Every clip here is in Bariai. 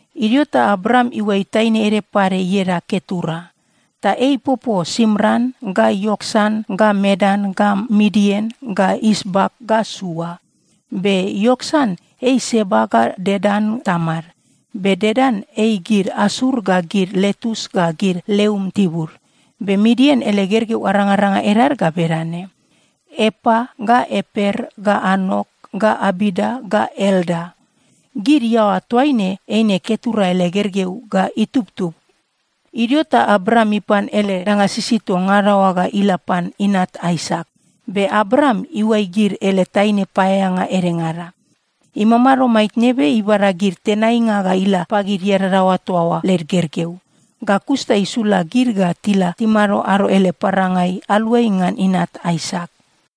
Idio ta Abraam iuai taine ede pade ieda Ketura. Ta ei ipopo Simran ga Ioksan ga Medan ga Midian ga Isbak ga Sua. Be Ioksan ei Seba ga Dedan tamad. Be Dedan ei gid Asur ga gid Letus ga gid Leum tibud. Be Midian ele gergeu arangaranga edad ga bedane: Epa ga Eper ga Anok ga Abida ga Elda. Gid iaoa toaine eine Ketura ele gergeu ga itubtub. Idio ta Abraam ipan ele danga sisid toa ngada oa ga ila pan inat Aisak. Be Abraam iuai gid ele taine paeaeanga edengada. Imamado maitne be ibada gid tenainga ga ila pagid iadadaoa toa oa led gergeu. Ga kus ta isula gid ga tila timado ado ele parangai, aluai ngan inat Aisak.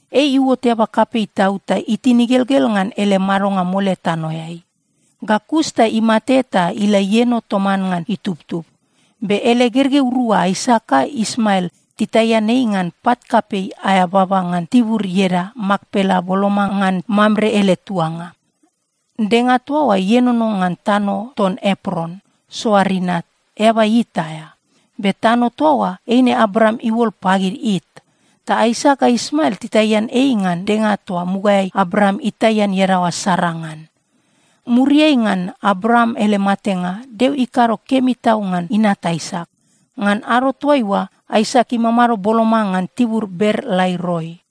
Ei iuot eaba kapei tau ta itin igelgel ngan ele madonga mole tanoeai. Ga kus ta imate ta ila ieno toman ngan itubtub. Be ele gergeu rua Aisak ga Ismael titaian ei ngan pat kapei aea baba ngan tibur ieda Makpela boloma ngan Mamre ele tuanga. Denga toa oa ienono ngan tano ton Epron, Soar inat, eaba It aea. Be tano toa oa, eine Abraam iuol pagid It. Ta Aisak ga Ismael titaian ei ngan denga toa mugaeai Abraam itaian iadaoa Sara ngan. Muriai ngan Abraam ele matenga, Deo ikado kemi tau ngan inat Aisak. Ngan ado toaiua, Aisak imamado boloma ngan tibur Ber-Laai-Roi.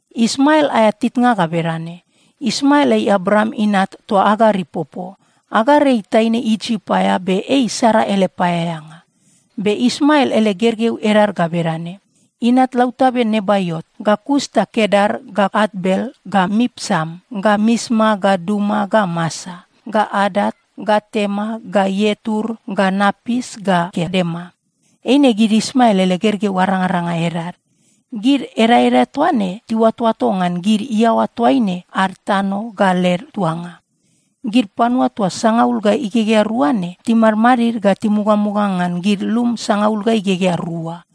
Ismael aea titnga ga bedane: Ismael ei Abraam inat toa Agar ipopo. Agar ei taine Isip aea be ei Sara ele paeaeanga. Be Ismael ele gergeu edad ga bedane: inat lautabe Nebaiot, ga kus ta Kedar ga Atbel ga Mipsam ga Misma ga Duma ga Masa ga Adat ga Tema ga Ietur ga Napis ga Kedema. Eine gid Ismael ele gergeu arangaranga edad. Gid edaeda toa ne tiuatoato ngan gid iaoa toaine ad tano ga led tuanga. Gid panua toa sangaul ga igegea rua ne, timadid ga timugamuga ngan gid lum sangaul ga igegea rua.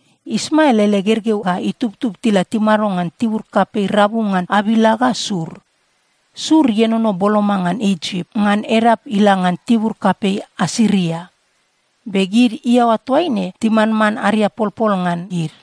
Ismael ele gergeu ga itubtub tila timado ngan tibur kapei rabu ngan Avila ga Sur. Sur ienono boloma ngan Isip, ngan edap ila ngan tibur kapei Asiria. Be gid iaoa toaine timanman ariapolpol ngan gid.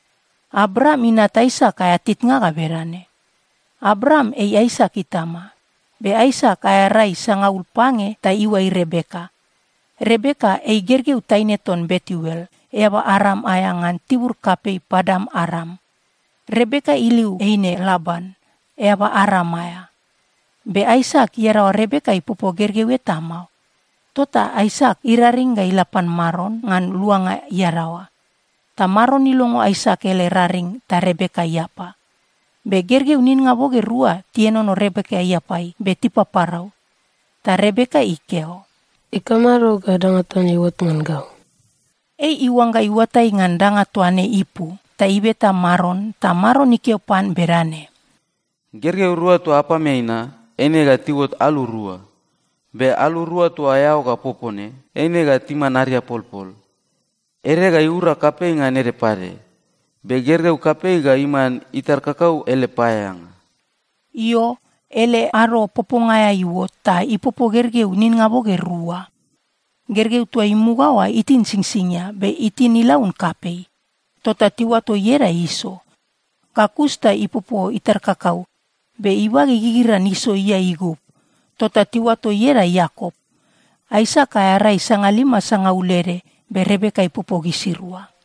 Abraam inat Aisak aea titnga ga bedane: Abraam ei Aisak itama. Be Aisak aea rai sangaul pange ta iuai Rebeka. Rebeka ei gergeu taine ton Betuel, eaba Aram aea ngan tibur kapei Padan-Aram. Rebeka iliu eine Laban, eaba Aram aea. Be Aisak iadaoa Rebeka ipopo gergeu eta mao. Tota Aisak iraring ga ila pan Maron ngan luanga iadaoa. Ta Maron ilongo Aisak ele raring ta Rebeka iapa. Be gergeu ninnga boge rua tienono Rebeka iapai, be tipaparau. Ta Rebeka ikeo, “Ikamado ga danga toa ne iuot ngan gau?” Ei iuangga iuatai ngan danga toa ne ipu, ta ibeta Maron. Ta Maron ikeo pan bedane, “Gergeu rua toa apameai na, eine ga tiuot alu rua. Be alu rua toa eao ga popo ne, eine ga timan ariapolpol. Ede ga iura kapei ngan ede pade. Be gergeu kapei ga iman itar kakau ele paeaeanga.” Io, ele ado poponga aea iuot ta ipopo gergeu ninnga boge rua. Gergeu toa imuga oa itin singsingia, be itin ilaun kapei. Tota tiuato ieda Iso. Ga kus ta ipopo itar kakau, be ibage igigiran Iso iae igub. Tota tiuato ieda Iakop. Aisak aea rai sangalima sangaul ede, be Rebeka ipopo gisirua.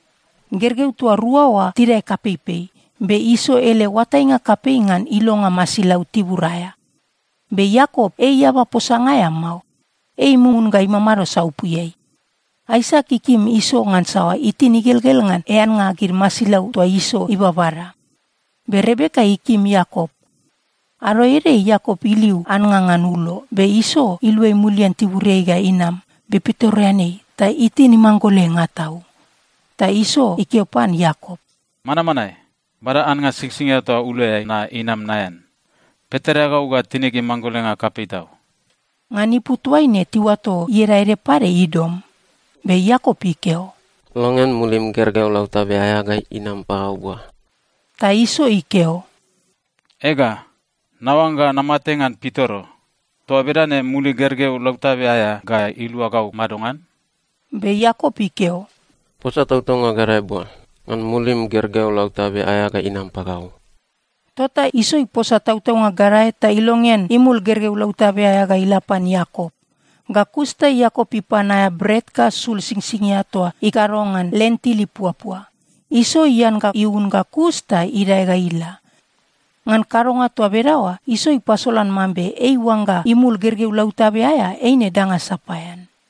Gergeu toa rua oa tidae kapeipei, be Iso ele oatainga kapei ngan ilonga masilau tibur aea. Be Iakop ei eaba posanga aea mao. Ei mumun ga imamado saupuiai. Aisak ikim Iso ngansa itin igelgel ngan eannga gid masilau toa Iso ibabada. Be Rebeka ikim Iakop. Ado ede Iakop iliu annga ngan ulo. Be Iso iluai mulian tiburiai ga inam be pitoreanei ta itin imanggolenga tau. Ta Iso ikeo pan Iakop, “Manmanae! Bada annga singsingia toa uloeai na inam naean. Pitoreagau ga tinig imanggolenga kapei tau.” (Ngan ipu toaine tiuato ieda ede pade Idom.) Be Iakop ikeo, “Longean mulim gergeu lautabe aea ga inam pagau bua.” Ta Iso ikeo, “Ega, naoangga namate ngan pitoro. Toa bedane mulig gergeu lautabe aea ga ilua gau madongan?” Be Iakop ikeo, “Posa tautaunga gadae bua, ngan mulim gergeu lautabe aea ga inam pagau.” Tota Iso iposa tautaunga gadae ta ilongean imul gergeu lautabe aea ga ila pan Iakop. Ga kus ta Iakop ipan aea bret ga sul singsingia toa ikado ngan lentil ipuapua. Iso ian ga iun ga kus ta idae ga ila. Ngan kadonga toa bedaoa, Iso ipasolan mambe ei iuangga imul gergeu lautabe aea eine danga sapaean.